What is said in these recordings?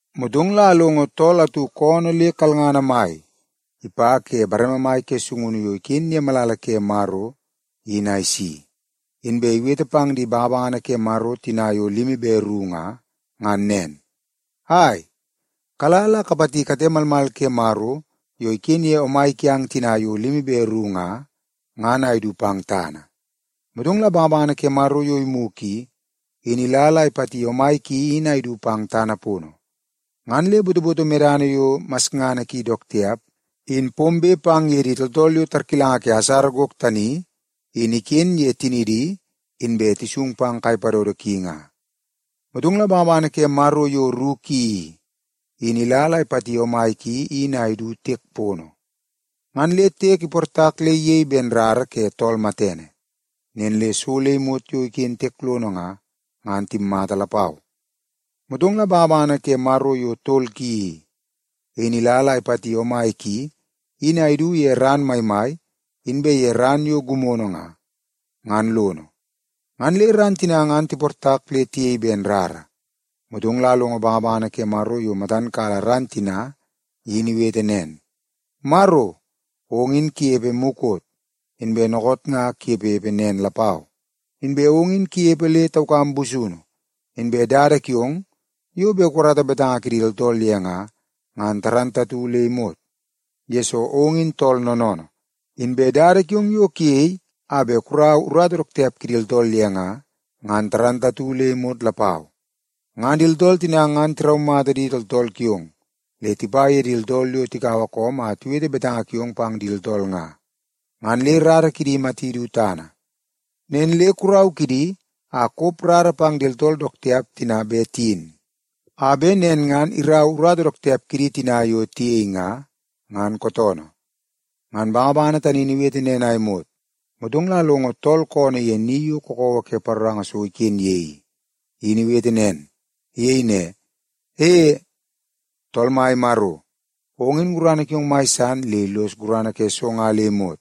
Motong la alongo tool atu koonoo le kalngana mai ipa ke bareme mai ke sungunu yo iken ye malala ke Maro in a isi. Inbe iwete pang di bangabangana ke Maro tina yo limi be ru nga, ngan nen, “Ai, kala la kapati kate malmal ke Maro yo iken ye omai kiang tina yo limi be ru nga, ngan a idu pang tana.” Motong la bangabangana ke Maro yo imugu i, in ila la ipati omai ki in a idu pang tana pono. Ngan le botoboto medana yo masngana ki dook tiap in pombe pang ye di tooltool yo tarkilanga ke asara gok tani in iken ye tinidi inbe tisung pang kai padodo ki nga. Motong la bangabangana ke Maro yo ru ki i, in ila la ipati omai ki in a idu tiek pono. Ngan le tiek iportak le iyei ben rara ke tool matene. Nen le so le imot yo iken tiek lono nga, ngan timmata lapau. Motong la bangabangana ke Maro yo tol ki i, in ila la ipati omai ki in a idu ye ran maimai inbe ye ran yo gimono nga, ngan lono. Ngan le ran tina ngan tiportak le tiyei ben rara. Motong la alongo bangabangana ke Maro yo matan kala ran tina in iwete nen, “Maro, ong in kunepe mukot, inbe dookoot ngan kunepepe nen lapau. Inbe ong in kunepe le taukam busunu. Inbe dada kiong yo bet kukarata betanga ke di tooltool ye nga, ngan dook mata le imot, yesoo ong in tool noonoonoo. Inbe dada kiong yo kuyei a bet kurau urata dook tiap kidi tooltool ye nga, ngan dook mata le imot lapau. Ngan di tooltool tina ngan tiraumata di tooltool kiong le tipa ye di tooltool yo tikaua koom a tiwete betanga kiong pang di tooltool nga, ngan le rara kidi imati du tana. Nen le kurau kidi a kop rara pang di tooltool dook tiap tina bet tiyin, a bet nen ngan irau urata dook tiap kidi tina yo tiyei nga, ngan kootoonoo.” Ngan bangabangana tani in iwete nen a imot, motong la alongo tool koonoo ye ni yo kakawa ke paroranga so iken ye i, in iwete nen. Iyei ne, “E, Tool Mai Maro, ong in gurana kiong mai san le illos gurana ke so nga le imot.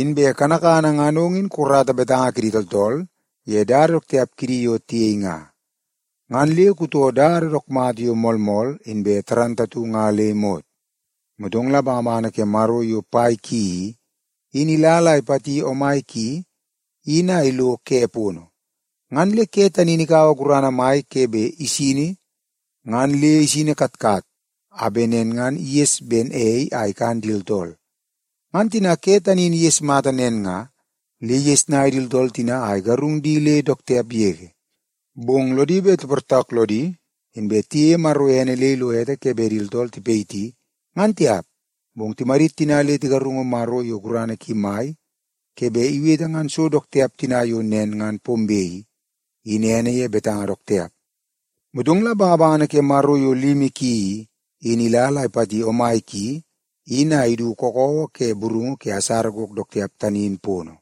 Inbe kanakana ngan ong in kukarata betanga kidi tooltool ye dada dook tiap kidi yo tiyei nga, ngan le kutoo dada dook mata yo moolmool nga le imot.” Motong la bangabangana ke Maro yo pai ki i, in ila la ipati omai ki in a ilo ke pono. Ngan le ke tani in ikaua gurana mai ke bet isini ngan le isini katkat a bet nen ngan iges ben ei a ikan di tooltool. Ngan tina ke tani in iges mata nen nga, le igesnai di tooltool tina a igarung di le dook tiap yege. Bong lodi bet tiportak lodi, inbe tiyeie Maro ene le ilo ete ke bet di tooltool tipayiti, ngan tiap. Bong timadit tina le tigarungu Maro yo gurana ki mai ke bet iwete ngan so dook tiap tina yo nen ngan pombe i, in ene ye betanga dook tiap. Motong la bangabangana ke Maro yo limi ki i, in ila la ipati omai ki in a idu kakawa ke burungu ke asara gok dook tiap tani in pono.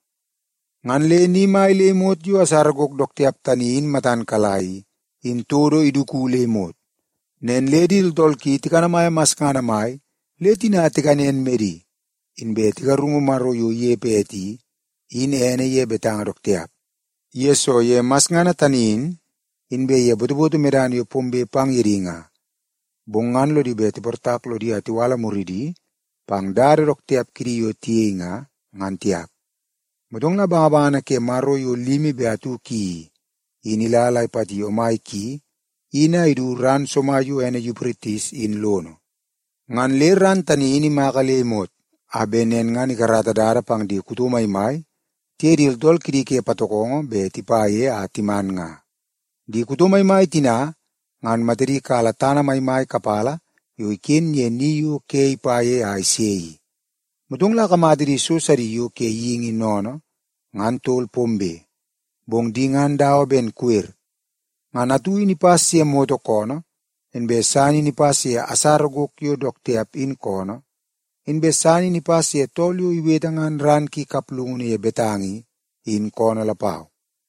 Ngan le ni mai le imot yo asara gok dook tiap tani in matan kala i, in todo iduku le imot. Nen le di tooltool ki tikanamaia masngana mai le tina tikanen medi, inbe tigarungu Maro yo inepe ete i, in ene ye betanga dook tiap, yesoo ye masngana tani in, inbe ye botoboto medana yo pombe pang ye di nga. Bong ngan lodi bet tiportak lodi a tiwala muridi pang dada dook tiap kidi yo tiyei nga, ngan tiap. Motong la bangabangana ke Maro yo limi be atu ki i, in ila la ipati omai ki in a idu ran somai yo ene Yupritis in lono. Ngan le ran tani in imaka le imot a bet nen ngan ikarata dada pang di kuto maimai tiye di tooltool kidi ke patokongo bet tipa ye a timan nga. Di kuto maimai tina ngan matadi kala tana maimai kapala yo iken ye ni yo ke ipa ye a ise i. Motong la akamata di so sidi yo ke geingi sennene ngan tol pombe, bong di ngan dawa ben kata. Ngan atu in ipas ye moto koonoo, inbe san in ipas ye asara gok yo dook tiap in koonoo, inbe san in ipas ye tool yo iwete ngan ran ki kaplungunu ye betanga i, in koonoo lapau.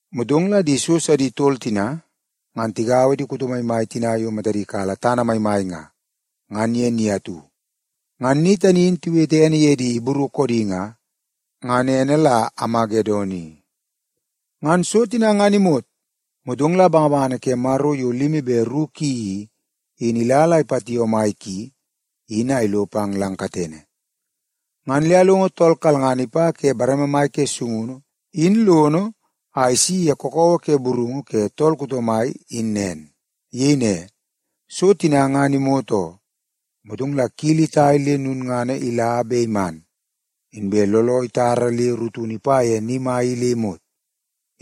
Motong la di so sidi tol tina ngan tigaua di kuto maimai tina yo matadi kala tana maimai nga, ngan ye ni atu. Ngan ni tani in tiwete ene ye di Ibru koodi nga, ngan ene la Amagedon i. Ngan so tina ngan imot, motong la bangabangana ke Maro yo limi be ru ki i, in ila la ipati omai ki in a ilo pang lang katene. Ngan le alongo tool kalngana ipa ke bareme mai ke sungunu in lono a isi ye kakawa ke burungu ke tool kuto mai in nen. Iyei ne, “So tina ngan imot oo.” Motong la kili itai le lulngana ila be iman, inbe looloo itara le rutunu ipa ye ni mai i le imot,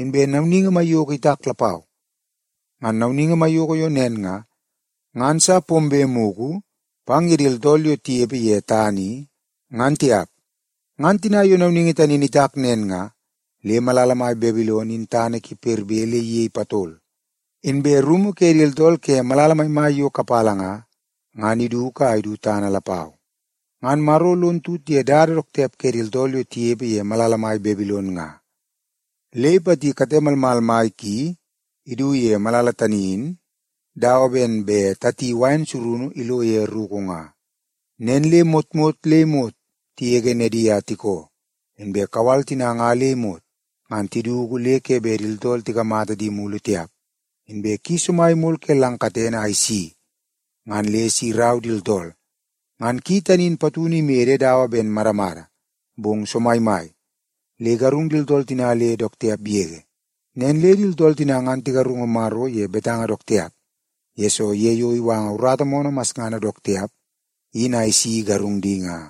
inbe nauningi maiyoko itak lapau. Ngan nauningi maiyoko yo nen nga, ngan sa pombe mugu pang ye di tooltool yo tinepe ye tana i, ngan tiap. Ngan tina yo nauningi tani in itak nen nga, le malala mai Babilon in tana ki perbe le iyei patol, inbe rumu ke di tooltool ke malala maimai yo kapala nga, ngan iduku a idu tana lapau. Ngan Maro lon tut ye dada dook tiap ke di tooltool yo tinepe ye malala mai Babilon nga, le ipati kate malmal mai ki idu ye malala tani in dawa ben bet tati wain surunu ilo ye ruku nga. Nen le motmot le imot tigege nedi a tikoo, inbe kawal tina nga le imot, ngan tiduku le ke bet di tooltool tikamata di mulu tiap. Inbe ki somai imol ke lang katene a isi ngan le si irau di tooltool. Ngan ki tani in patunu imede dawa ben madamada, bong somaimai le igarung di tooltool tina le dook tiap yege. Nen le di tooltool tina ngan tigarungu Maro ye betanga dook tiap, yesoo ye yo iwanga urata moonoo masngana dook tiap in a isi igarung di nga.